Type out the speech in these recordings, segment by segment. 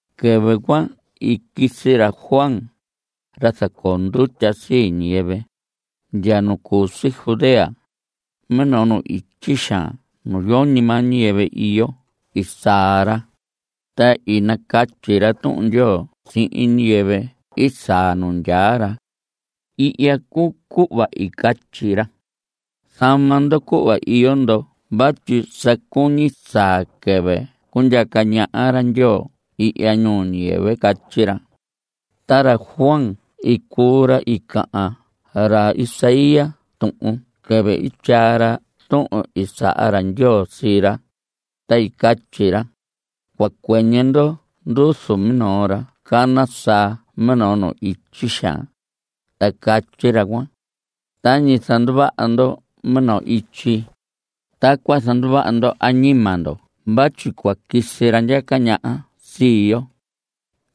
Quɨvɨ cuan i quisi ra Juan, ra zacoo ndutya sii ñiyɨvɨ, ndya nu cu si Judea. Minoo nu ityi xaan nu yoñi maa ñiyɨvɨ iyo i saa ra, ta i nacatyi ra Tuhun Ndyoo sihin ñiyɨvɨ i saa nu ndyaa ra. Ihya cuu cuhva i catyi ra: Zama ndo cuhva iyo ndo vatyi sa cuñi saa quɨvɨ cundyaca ñaha ra Ndyoo ihya ñuu ñiyɨvɨ. Catyi ra. Ta ra Juan cuu ra i cahan ra Isaías tuhun quɨvɨ i tyaa ra tuhun i saha ra Ndyoo sii ra, ta i catyi ra: Cua cuɨñɨ ndo nduzu minoo ra cana saa minoo nu ityi xaan. Ta catyi ra cuan: “Tañi zanduvaha ndo minoo ityi, tacuan zanduvaha ndo añima ndo vatyi cua quisi ra ndyaca ñaha sii yo.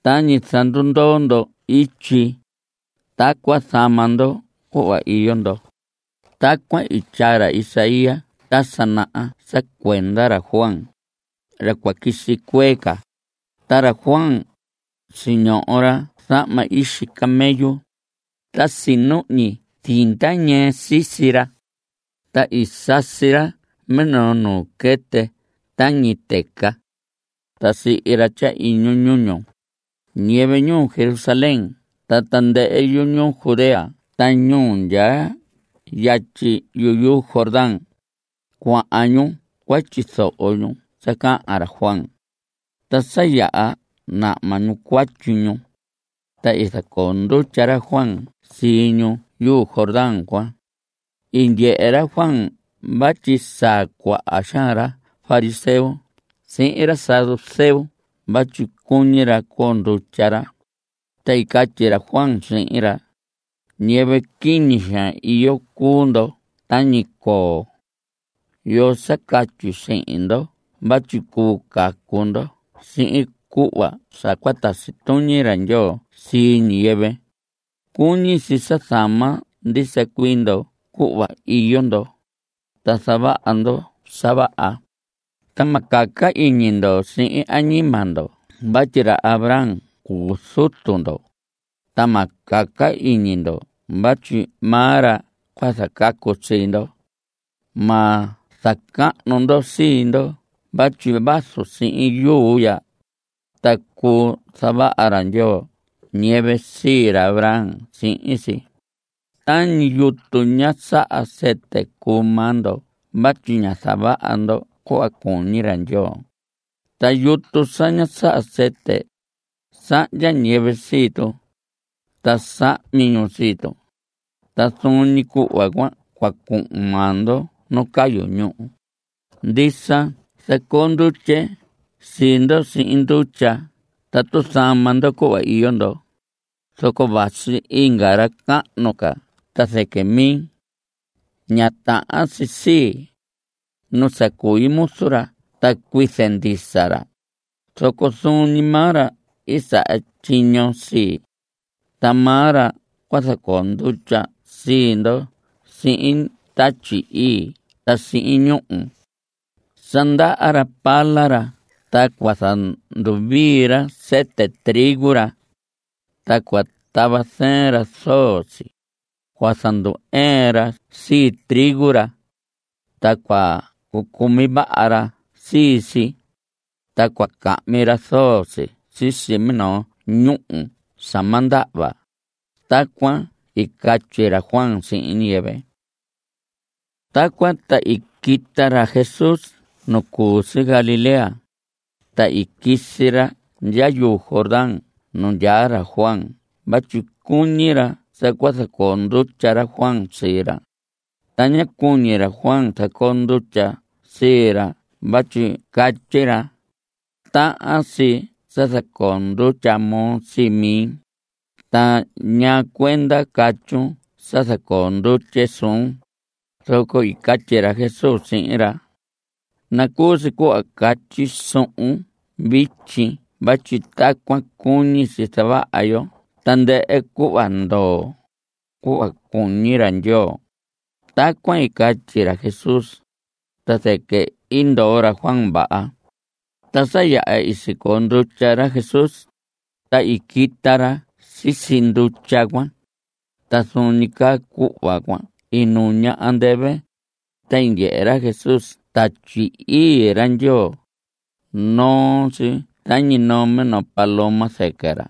Tañi zandundoo ndo ityi, tacuan zama ndo cuhva iyo ndo.” Tacuan i tyaa ra Isaías ta sa naha sa cuenda ra Juan, ra cua quisi cuee ca. Ta ra Juan cuan, siñoho ra zahma ixi camello. Ta sinuhñi zinda ñɨɨ sisi ra. Ta i sasi ra minoo nuu quɨtɨ tañi tɨca, ta sihi ra tyahiñu ñuñu. Ñiyɨvɨ ñuu Jerusalén ta tandɨhɨ yuñuu Judea ta ñu ndyaa yatyi yuu Jordán, cuahan ñu cua tyizoho ñu sa cahan ra Juan. Ta sa yaha nahma ñu cuatyi ñu, ta i zacoo ndutya ra Juan sii ñu yuu Jordán cuan. I ndyehe ra Juan vatyi saa cuaha xaan ra fariseo sihin ra saduceo vatyi cuñi ra coo ndutya ra, ta i catyi ra Juan sihin ra: ¡Ñiyɨvɨ quiñi xaan iyo cuu ndo tañi coo! ¿Yoo sa catyi sihin ndo vatyi cuu cacu ndo sihin cuhva sa cua tasi tuñi ra Ndyoo sii ñiyɨvɨ? Cuñi si sa zama ndisa cuii ndo cuhva iyo ndo, ta zavaha ndo sa vaha. Ta ma caca iñi ndo sihin añima ndo vatyi ra Abraham cuu zutu ndo, ta ma caca iñi ndo vatyi maa ra cua zacacu sii ndo. Ma zacahnu ndo sii ndo vatyi vazu sihin yuu ya, ta cuu zavaha ra Ndyoo ñiyɨvɨ sii ra Abraham sihin si. Tañi yutu ña saha sɨtɨ cuu maa ndo vatyi ña zavaha ndo cuhva cuñi ra Ndyoo. Ta yutu sa ña saha sɨtɨ, sahndya ñiyɨvɨ sii tu. Ta sahmi ñu sii tu. Ta zuun ñi cuhva cuan cua cuhun maa ndo nu cayu ñúhu. Ndisa zacoo ndutye sii ndo sihin ndutya tatu zama ndo cuhva iyo ndo. Zoco vasi inga ra cahnu ca ta zɨquɨ mi. Ña tahan si sii, nu sa cui muzu ra ta cuize ndisa ra, zoco zuun ñi maa ra i saha tyiño sii. Ta maa ra cua zacoo ndutya sii ndo sihin Tatyi Ii ta sihin ñúhu. Sa ndaha ra pala ra ta cua zanduvii ra sɨtɨ trigo ra, ta cua tava zɨɨn ra zoo si. Cua zandu‑ɨɨn ra sii trigo ra, ta cua cucumi vaha ra sii si, ta cua cahmi ra zoo si sisi minoo ñúhu sa ma ndahva. Tacuan i catyi ra Juan sihin ñiyɨvɨ. Tacuan ta i quita ra Jesús nu cu si Galilea, ta i quisi ra ndya yuu Jordán nu ndyaa ra Juan vatyi cuñi ra sa cua zacoo ndutya ra Juan sii ra. Ta ñá cuñi ra Juan zacoo ndutya sii ra vatyi catyi ra: Tahan si sa zacoo ndutya moo sii mi. ¿Ta ñaa cuenda catyun sa zacoo ndutye suun? Zoco i catyi ra Jesús sihin ra: Nacuu si cuhva catyi suhun vityi vatyi tacuan cuñi si zavaha yo tandɨhɨ cuhva ndoo, cuhva cuñi ra Ndyoo. Tacuan i catyi ra Jesús, ta zɨquɨ i ndoo ra Juan vaha. Ta sa yaha i sicoo ndutya ra Jesús, ta i quita ra sisi ndutya cuan. Ta zuun ñi caa cuhva cuan i nuña andɨvɨ, ta i ndyehe ra Jesús Tatyi Ii ra Ndyoo. Noo si tañi noo minoo paloma zɨquɨ ra.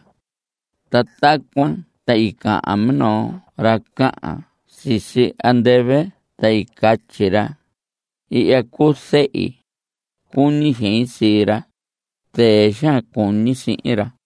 Ta tacuan ta i cahan minoo ra cahan sisi andɨvɨ ta i catyi ra: Ihya cuu zehi. Cuñi xein sii ra. Zɨɨ xaan cuñi sihin ra.